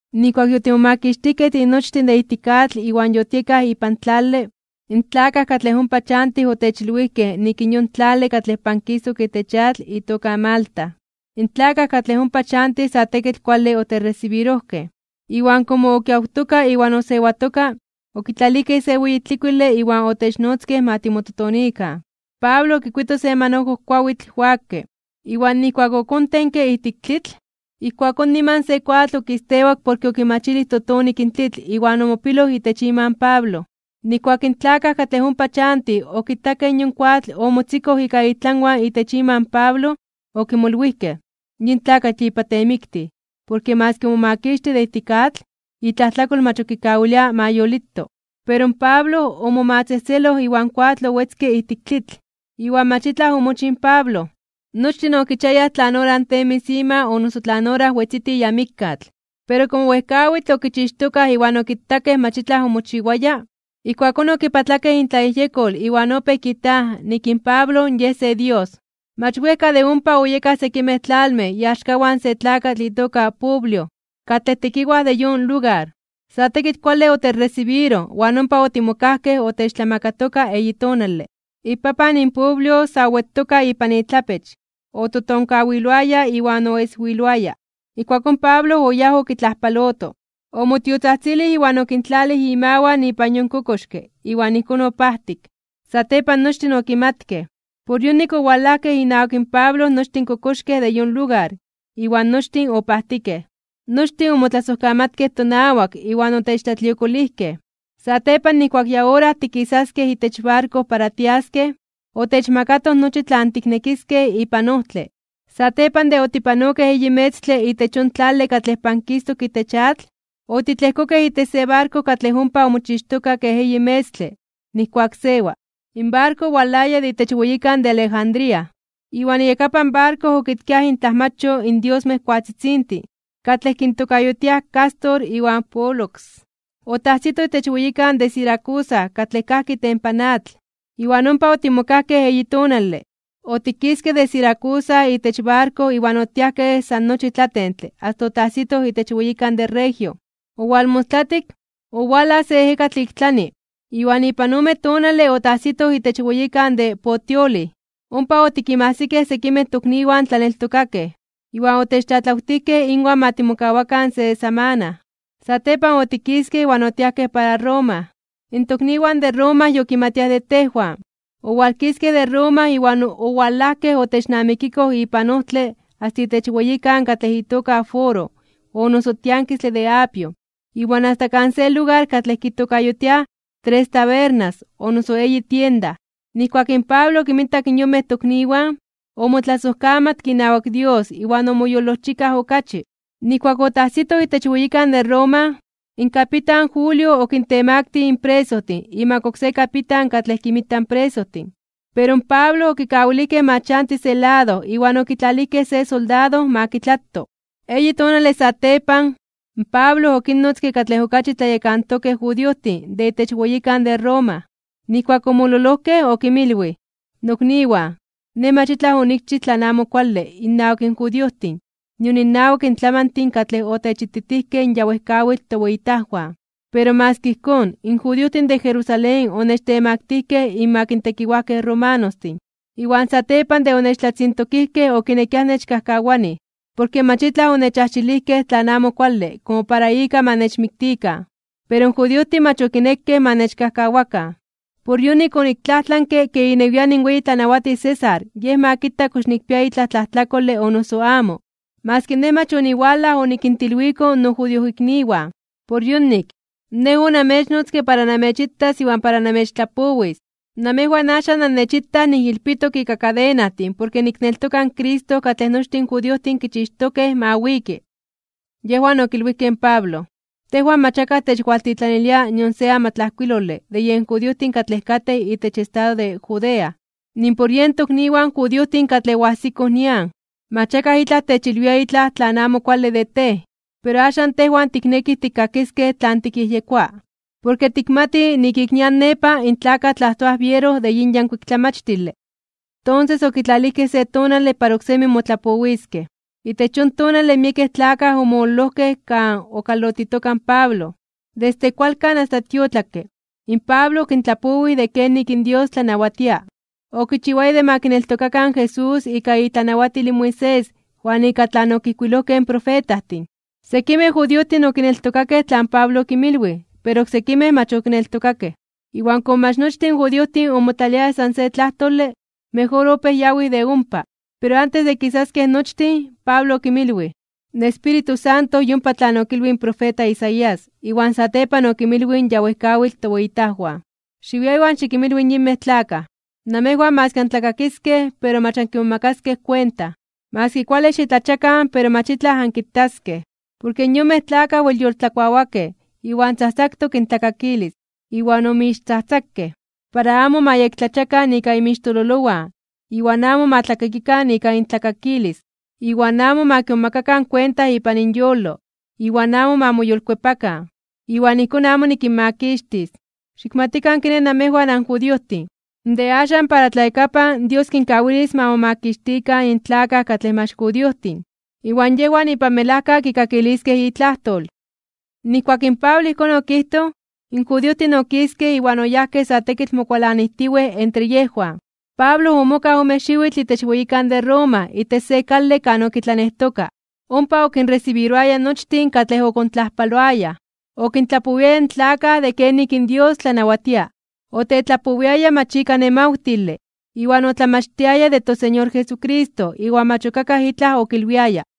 Nijkuak yotimomakixtijkej tinochtin de ijtik atl iwan yotiekaj ipan tlale, in tlakaj katlej ompa chantij otechilwijkej nik in yon tlale katlej pankistok itech atl itoka Malta. In tlakaj katlej ompa chantij sa tekitl kuale otechresibirojkej. Iwan komo okiawtoka iwan osewatoka, okitlalijkej se weyi tlikuile iwan otechnotzkej ma timototonikan. Pablo okikuito se manojo kuawitl wakke, iwan nijkuak okontenke ijtik in tlitl, ijkuakón niman se koatl okistewak porke okimachilij totonik in tlitl iwan omopiloj itech ima in Pablo. Nijkuak in tlakaj katlej ompa chantij okitakej yon koatl omotzikoj ika itlanwan itech ima in Pablo, okimolwijkej: ―Yin tlakatl yipa temiktij, porke maski omomakixtij de ijtik atl, itlajtlakol mach ok kikawilia ma yolito. Pero in Pablo omomatzejtzeloj iwan koatl owetzke ijtik tlitl, iwan mach itlaj omochij in Pablo. Nochtin okichiayaj tlan ora temis (posawis) ima o noso tlan ora wetziti ya mikkatl. Pero komo wejkawitl okichixtokaj iwan okitakej mach itlaj omochiwaya, ijkuakón okipatlakej intlayejyekol iwan opéj kijtaj nik in Pablo yej se dios. Mach wejka de ompa oyekaj sekimej tlalmej iaxkawan se tlakatl itoka Publio, katlej tekiwaj de yon lugar. Sa tekitl kuale otechresibiroj iwan ompa otimokajkej otechtlamakatoka eyi tonale. Ipapan in Publio sa owetoka ipan itlapech, ototonkawiloaya iwan oeswiloaya. Ijkuakón Pablo oyáj okitlajpaloto. Omotiotzajtzilij iwan okintlalij imawan ipan yon kokoxke, iwan ijkón opajtik. Satepan nochtin okimatkej. Por yonik owalajkej inawak in Pablo nochtin in kokoxkej de yon lugar, iwan nochtin opajtikej. Nochtin omotlasojkamatkej tonawak iwan otechtlatliokolijkej. Satepan nijkuak ya ora tikisaskej itech barko para tiaskej, otechmakatoj nochi tlan tiknekiskej ipan ojtle. Satepan de otipanokej eyi metztle itech yon tlale katlej pankistok itech atl, otitlejkokej itech se barko katlej ompa omochixtoka kej eyi metztle nijkuak sewa. In barko owalaya de itech weyikan de Alejandría, iwan iyakapan barko okitkia intlajmacho in diosmej koatzitzintin katlej kintokayotiaj Cástor iwan Pólux. Otajsitoj itech weyikan de Siracusa katlej kajki itempan atl, iwan ompa otimokajkej eyi tonale. Otikiskej de Siracusa itech barko iwan otiajkej san nochi tlatentle asta otajsitoj itech weyikan de Regio. Owalmostlatik, owalaj se ejekatl de ik tlani, iwan ipan ome tonale otajsitoj itech weyikan de Puteoli. Ompa otikinmajsikej sekimej tokniwan tlaneltokakej, iwan otechtlatlawtijkej inwan ma timokawakan se samana. Satepan otikiskej iwan otiajkej para Roma. In tokniwan de Roma yokimatiaj de tejwan. Owalkiskej de Roma iwan owalajkej otechnamikikoj ipan ojtle asta itech weyikan katlej itoka Foro o noso tiankistle de Apio iwan asta kan se lugar katlej kitokayotiaj Tres Tabernas o noso Eyi Tienda. Nijkuak in Pablo okinmitak in yonmej tokniwan, omotlasojkamatke inawak Dios iwan omoyolojchikaj okachi. Nijkuak otajsitoj itech weyikan de Roma, in kapitan Julio okintemaktij (okintemaktilij) in presojtin imak oksé kapitan katlej kinmita in presojtin. Pero in Pablo okikawilijkej ma chanti se lado iwan okitlalijkej se soldado ma kitlato. Eyi tonale satepan, Pablo okinnotzke katlej okachi tlayekantokej judiojtin de itech weyikan de Roma. Nijkuak omololojkej okinmilwij: ―Nokniwan, nej mach itlaj onikchij tlan amo kuale innawak in judiojtin nion innawak in tlamantin katlej otechititijkej in ya wejkawitl toweyitajwan. Pero maski ijkón, in judiojtin de Jerusalén onechtemaktijkej (onechtemaktilijkej) inmak in tekiwajkej romanostin. Iwan satepan de onechtlatzintokijkej okinekiaj nechkajkawanij, porke mach itlaj onechajxilijkej tlan amo kuale komo para ika ma nechmiktikan. Pero in judiojtin mach okinekej ma nechkajkawakan. Por yonik oniktlajtlanke ke inewian in weyi tlanawatij César yej ma kita kox nikpia itlaj tlajtlakole o noso amo, maski nej mach oniwalaj onikintilwiko nojudiojikniwan. Por yonik, nej onamechnotzke para namechitas iwan para namechtlapowis. Namejwan axan annechitaj niijilpitok ika kadenajtin porke nikneltoka in Cristo katlej nochtin in judiojtin kichixtokej ma wiki. Yejwan okilwijkej in Pablo: ―Tejwan mach akaj techwaltitlanilia nion se amatlajkuilole de yen judiojtin katlej katej itech estado de Judea. Nimpor yen tokniwan judiojtin katlej oajsikoj nian, mach akaj itlaj techilwia itlaj tlan amo kuale de tej. Pero axan tejwan tiknekij tikkakiskej tlan tikyejyekoa. Porke tikmatij ik nian nepa in tlakaj tlajtoaj biero de yin yankuik tlamachtile. Tonses okitlalijkej se tonale para oksemi motlapowiskej. Itech yon tonale miekej tlakaj omololojkej kan okalotitoka in Pablo. Desde kualkan asta tiotlakke, in Pablo okintlapowij de kenik in Dios tlanawatia. Okichiwaya de ma kineltokakan in Jesús ika itlanawatil in Moisés iwan ika tlan okijkuilojkej in profetajtin. Sekimej judiojtin okineltokakej tlan Pablo okinmilwij, pero oksekimej mach okineltokakej. Iwan komo mach nochtin in judiojtin omotlaliayaj san se tlajtole, mejor opéj yawij de ompa. Pero antes de kisaskej nochtin, Pablo okinmilwij: ―In Espíritu Santo yompa tlan okilwij in profeta Isaías iwan satepan okinmilwij in ya wejkawitl toweyitajwan: Xiwia iwan xikinmilwi in yonmej tlakaj: Namejwan maski antlakakiskej, pero mach ankimomakaskej kuenta. Maski kuale xitlachiakan pero mach itlaj ankitaskej. Porke yonmej tlakaj wel yoltlakuawakej, iwan tzajtzaktok intlakakilis, iwan omixtzajtzakej. Para amo ma yektlachiakan ika inmixtololowan, iwan amo ma tlakakikan ika intlakakilis, iwan amo ma kimomakakan kuenta ipan inyolo, iwan amo ma moyolkuepakan, iwan ijkón amo nikinmakixtis. Xikmatikan kiné namejwan anjudiojtin, de axan para tlayakapan Dios kinkawilis ma momakixtikan in tlakaj katlej mach judiojtin. Iwan yejwan ipan melajka kikakiliskej itlajtol. Nijkuak in Pablo ijkón okijtoj, in judiojtin okiskej iwan oyajkej sa tekitl mokualanijtiwej entre yejwan. Pablo omokaj ome xiwitl itech weyikan de Roma itech se kale kan okitlanejtoka. Ompa okinresibiroaya nochtin katlej okontlajpaloayaj. Okintlapowiaya in tlakaj de kenik in Dios tlanawatia. Otetlapowiaya mach ika nemawtile, iwan otlamachtiaya de toSeñor Jesucristo iwan mach ok akaj itlaj okilwiaya.